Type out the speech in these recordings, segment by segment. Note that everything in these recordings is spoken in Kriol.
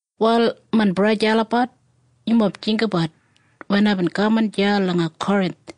Wal main braja en sista olabat, yumob jinggabat wen aibin kaman deya langa Korinth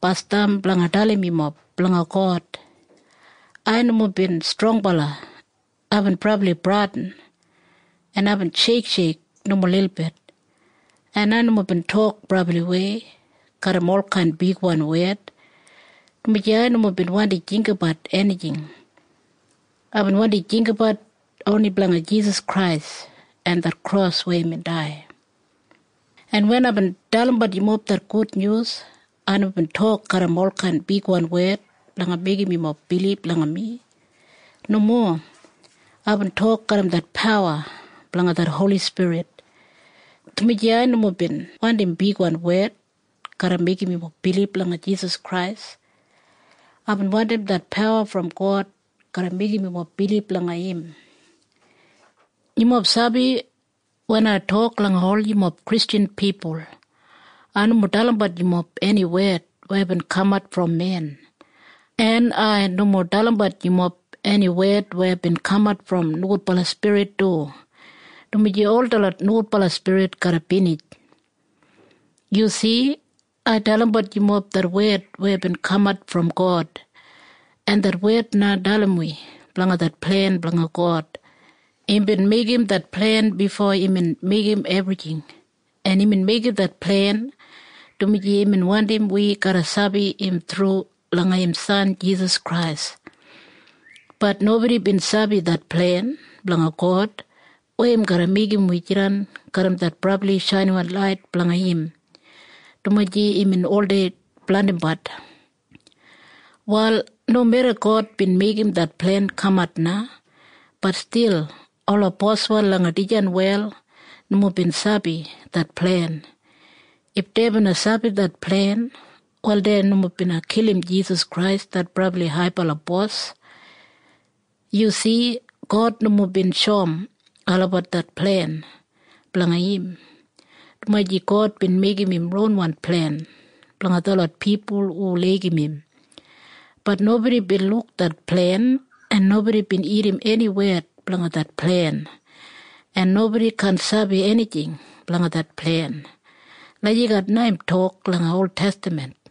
basdam blanga dalim yumob blanga God. Ai nomo bin strongbala. Aibin brabli bradin, en aibin sheiksheik nomo lilbit, en ai nomo bin tok brabliwei garram olkain bigwan wed, dumaji ai nomo bin wandi jinggabat enijing. Aibin wandi jinggabat oni blanga Jisas Krais en det kros weya imbin dai. En wen aibin dalimbat yumob det gudnyus, ai nomo bin tok garram olkain bigwan wed blanga meigim yumob bilib langa mi. Nomo. Aibin tok garram det pawa blanga det Holi Spirit, dumaji ai nomo bin wandim bigwan wed garra meigim yumob bilib langa Jisas Krais. Aibin wandim det pawa brom God garra meigim yumob bilib langa im. Yumob sabi? Wen ai tok langa ol yumob Kristjan pipul, ai nomo dalimbat yumob eni wed weya bin kamat brom pipul. En ai nomo dalimbat yumob eni wed weya bin kamat brom nogudbala spirit du, dumaji ol detlot nogudbala spirit garra binij. Yu si? Ai dalimbat yumob det wed weya bin kamat brom God, en det wed na dalim wi blanga det plen blanga God. Imbin meigim det plen bifo imbin meigim ebrijing, en imbin meigim det plen dumaji imbin wandim wi garra sabi im thru langa im san Jisas Krais. Bat nobodi bin sabi det plen blanga God weya im garra meigim wi jidan garram det brabli shainiwan lait blanga im, dumaji imbin oldei blandimbat. Wal nomeda God bin meigim det plen kamat na, bat stil ola boswan langa dijan wel nomo bin sabi det plen. If dei bina sabi det plen, wal dei nomo bina kilim Jisas Krais det Brabli Haibala Bos. Yu si? God nomo bin shoum olabat det plen blanga im, dumaji “God bin meigim im ronwan plen blanga detlot pipul hu laigim im. Bat nobodi bin luk det plen, en nobodi bin irrim eni wed blanga det plen, en nobodi kaan sabi enijing blanga det plen.” Lagijat na im tok langa oltestaman.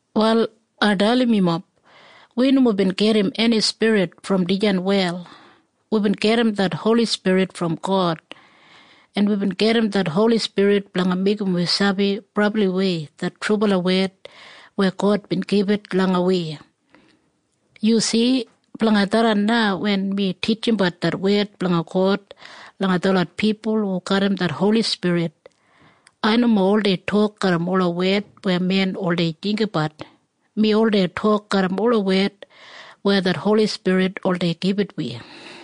Wal ai dalim yumob. Wi nomo bin gedim eni spirit brom dijan wel. Wibin gedim det Holi Spirit brom God. En wibin gedim det Holi Spirit blanga meigim wi sabi brabliwei det trubala wed weya God bin gibit langa wi. Yu si? Blanga tharran na wen mi titjimbat det wed blanga God langa detlot pipul hu garram det Holi Spirit, ai nomo oldei tok garram ola wed weya pipul oldei jinggabat. Mi oldei tok garram ola wed weya det Holi Spirit oldei gibit wi.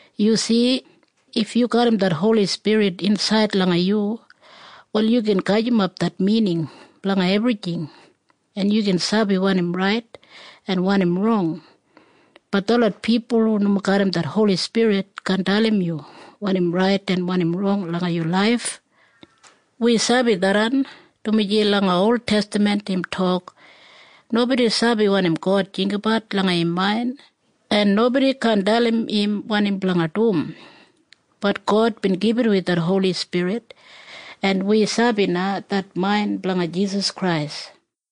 Yu si? If yu garram det Holi Spirit insaid langa yu, wal yu gin gajimap det mining blanga ebrijing, en yu gin sabi wanim rait en wanim rong. Bat detlot pipul hu nomo garram det Holi Spirit kaan dalim yu wanim rait en wanim rong langa yu laif. Wi sabi tharran, dumaji langa oltestaman im tok, “Nobodi sabi wanim God jinggabat langa im main. En nobodi kaan dalim im wanim blanga dum.” Bat God bin gibit wi det Holi Spirit, en wi na sabi det main blanga Jisas Krais.